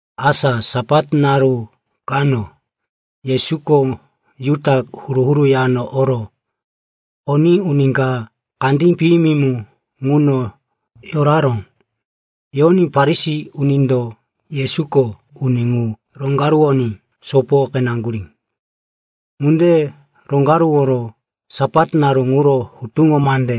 Asa Sapat naru kano, Yesuko Juda koro huru-huru yano oró. Oní uni ka kandí piyimi mu ŋuno yoraró. Yoní Farisi unindo Yesuko uni ŋu roŋgaruwoní sopo qeneŋgurí. Ŋunde roŋgaruworo Sapat naru ŋuro hutuŋo mande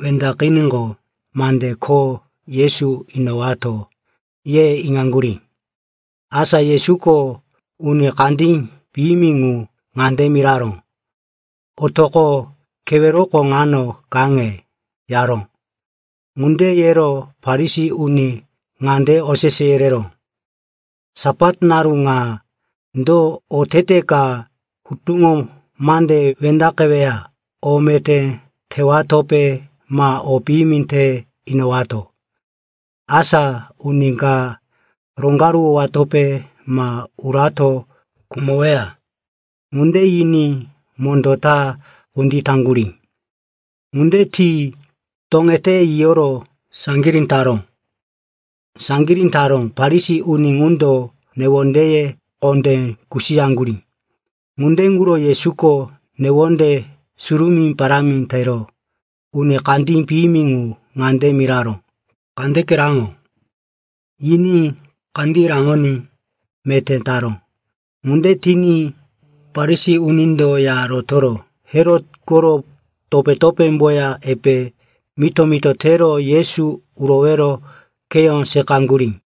wendaqiníqo, mande kho Yesu inowato, ye iŋaŋgurí. Asa Yesuko uni kandí piyimi ŋu ŋande miraró, “Otoqo, keweroko ŋano kaŋe,” yaró. Ŋunde yero Farisi uni ŋande osese yereró, “Sapat naru ŋa do otete ka hutuŋo mande wendaqeweya? O meté tewatope ma o piyimi te inowato, asa uni ka roŋgaruwowatope ma urato khumoweya?” Ŋunde yiní mondó ta kunditaŋgurí. Ŋunde ti toŋete yiyoro saŋgirí taró. Farisi uni ŋundo newondeye kondé kusiyaŋgurí. Ŋunde ŋuro Yesuko newonde surumí parámi tero uni kandí piyimi ŋu ŋande miraró, “Kandeke raŋo.” Yiní kandí raŋoní meté taró. Ŋunde tiní Farisi unindo ya rotoro Herot koro topé-topémboya epe mito-mito tero Yesu urowero kheyó seqaŋgurí.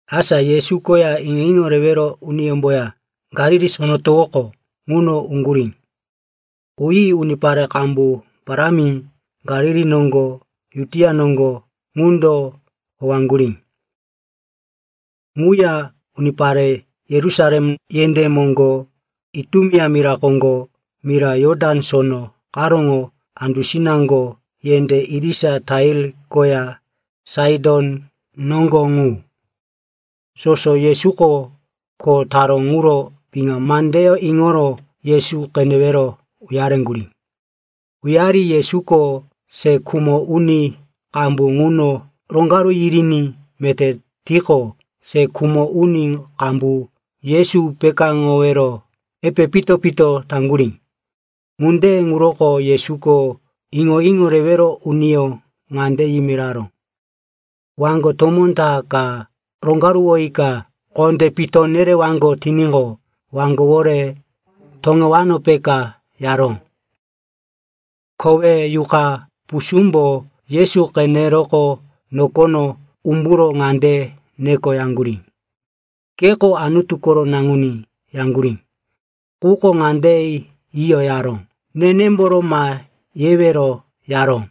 Asa Yesu koya iŋo-iŋo rewero uniyómboya Galili Sono Towoko ŋuno uŋgurí. Uyi unipare qambu parámi Galili noŋgo, Judia noŋgo ŋundo howaŋgurí. Ŋuya unipare Yerusalem yendé moŋgo, Itumea mira koŋgo, mira Jotan Sono karóŋo andusinaŋgo, yendé irisa Tair koya Saiton noŋgo ŋu, soso Yesuko kho taró ŋuro piŋa mandeyó iŋoro Yesu qenewero uyareŋgurí. Uyari Yesuko se khumo uni qambu ŋuno roŋgaru yiriní meté tiqo, se khumo uni qambu Yesu pekáŋowero epe pito-pito taŋgurí. Ŋunde ŋuroko Yesuko iŋo-iŋo rewero uniyó ŋande yimiraró, “Waŋgo tomó ta ka roŋgaruwoyika kondé pito nerewaŋgo tiníqo, waŋgowore toŋewano, peka,” yaró. Kowe yuqa pusúmbo Yesu qeneroqo nokono umburo ŋande nekoyaŋgurí, “Keko Anutu koro Naŋuní,” yaŋgurí. Quko ŋande yiyo yaró, “Nenemboro ma yewero,” yaró.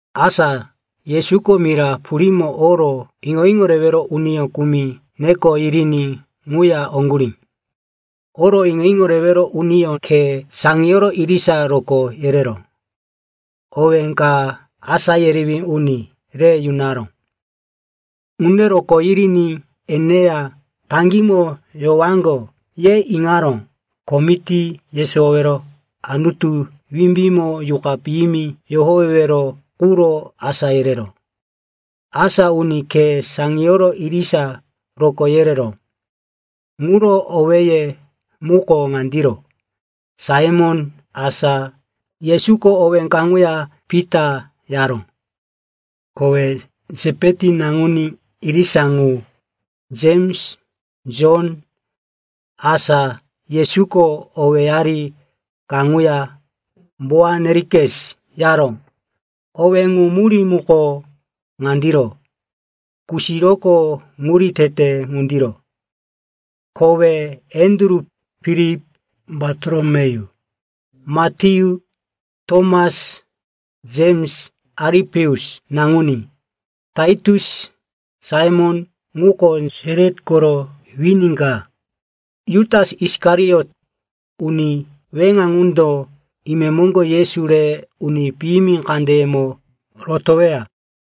Asa Yesuko mira purímo oro iŋo-iŋo rewero uni kumi neko yiriní ŋuya oŋgurí. Oro iŋo-iŋo rewero uniyó khe saŋiyoro irisa rokó yerero owé ka “asá yerewí uni” re yunaró. Ŋunde rokó yiriní eneya taŋgímo yowaŋgo, ye iŋaró, ko miti yesowowero, Anutu wimbímo yuqa piyimi yohowewero quro asá yereró. Asa uni khe saŋiyoro irisa rokó yereró ŋuro owéye muko ŋandiro: Saimon (asa Yesuko owé kaŋuya Pita yaró). Kowe Sepeti naŋuní irisa ŋu Jems, Jon (asa Yesuko owéyari kaŋuya Boanerikes yaró. Owé ŋu murí muko ŋandiro: Kusiroko Ŋuri Tete ŋundiro.) Kowe Andru, Filip, Bartolomeyu, Matyu, Tomas, Jems Alipeus naŋuní, Tatius, Saimon, ŋuko Selot koro wini ka, Jutas Isikariot. Uni weŋa ŋundo imemoŋgo Yesu re uni piyimi kandeyemo rotoweya.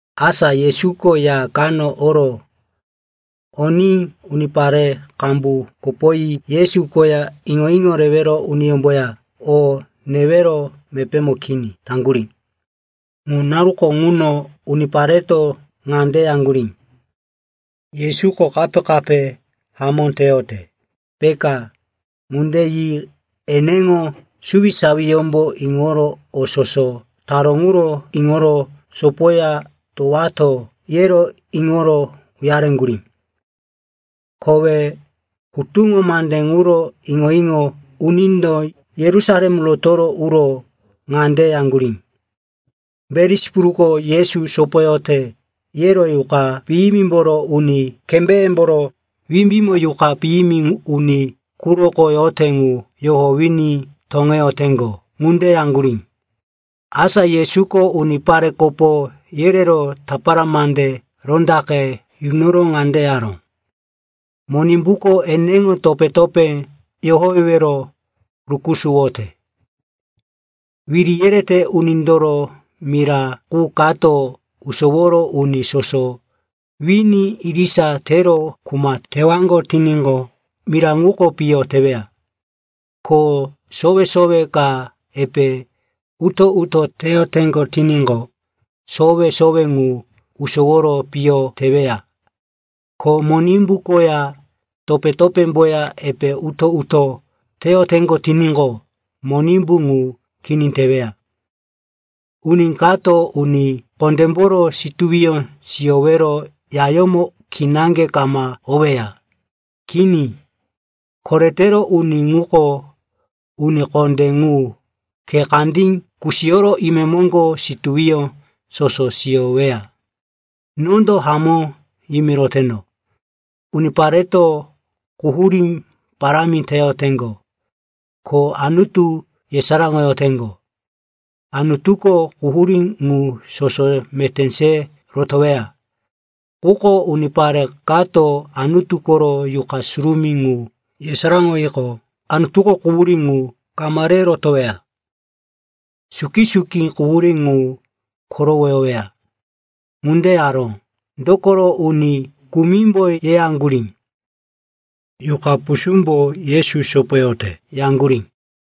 Asa Yesuko ya kano oró. Oní unipare qambu kopoyi Yesu koya iŋo-iŋo rewero uniyómboya o newero mepémo kini taŋgurí. Ŋu naruko ŋuno unipareto ŋande yaŋgurí, “Yesuko kape-kape hamó teyote, peka.” Ŋunde yi eneŋo suwisawiyómbo iŋoro o soso taró ŋuro iŋoro, sopoya towato, yero iŋoro uyareŋgurí. Kowe hutuŋo mande ŋuro iŋo-iŋo unindo Yerusalem roto uro ŋande yaŋgurí, “Belisipuluko Yesu sopoyote,” yero “Yuqa piyimimboro uni kembéyemboro wimbímo yuqa piyimi uni quroko yote ŋu yohowiní toŋeyoteŋgo,” ŋunde yaŋgurí. Asa Yesuko unipare kopo yerero tapara mande rondaqe yunoro ŋande yaró, “Monimbuko eneŋo topé-topé yohowewero rukusuwote. Wiri yerete unindoro mira qu kato usoworo uni soso wini irisa tero kuma tewaŋgo tiníqo, mira ŋuko piyo teweya. Ko sowe-sowe ka epe uto-uto teyoteŋgo tiníqo, sowe-sowe ŋu usoworo piyo teweya. Ko Monimbu koya topé-topémboya epe uto-uto teyoteŋgo tiníqo, Monimbu ŋu kini teweya. Uni kato uni kondémboro situwiyó siyowero yayómo kinaŋge kama oweya. Kini. Koretero uni ŋuko uni kondé ŋu khe kandí kusiyoro imemoŋgo situwiyó soso siyoweya. Nondo hamó yimiroteno. Unipareto quhurí parámi teyoteŋgo, ko Anutu yesaráŋoyoteŋgo. Anutuko quhurí ŋu soso meté se rotoweya. Quko unipare kato Anutu koro Yuqa Surumí ŋu yesaráŋoyiqo, Anutuko quhurí ŋu kama re rotoweya. Suki-suki quhurí ŋu korowoyoweya.” Ŋunde yaró, dokoro uni kumimbo yeyaŋgurí, “Yuqa pusúmbo Yesu sopoyote,” yaŋgurí.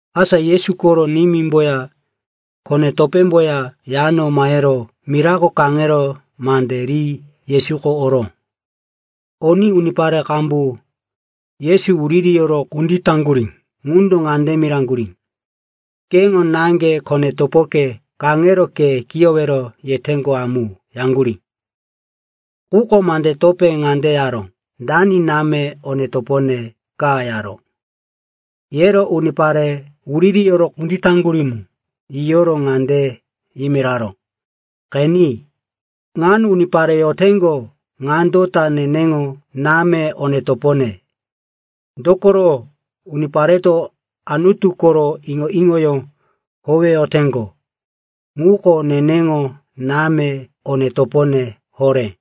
Asa Yesu koro nimímboya kone-topémboya yano mahero mirako kaŋero mande ri Yesuko oró. Oní unipare qambu Yesu wuririyoro kunditaŋgurí ŋundo ŋande miraŋgurí, “Qeno, náŋge, kone-topoke, kaŋero ke kiyowero yeteŋgo amu,” yaŋgurí. Quko mande topé ŋande yaró, “Dani náme, one-topone ka?” yaró. Yero unipare wuririyoro kunditaŋgurí mu yiyoro ŋande yimiraró, “Qeni, ŋano unipare yoteŋgo ŋando ta neneŋo náme, one-topone. Dokoro unipareto Anutu koro iŋo-iŋoyó howeyoteŋgo ŋuko neneŋo náme, one-topone horé.”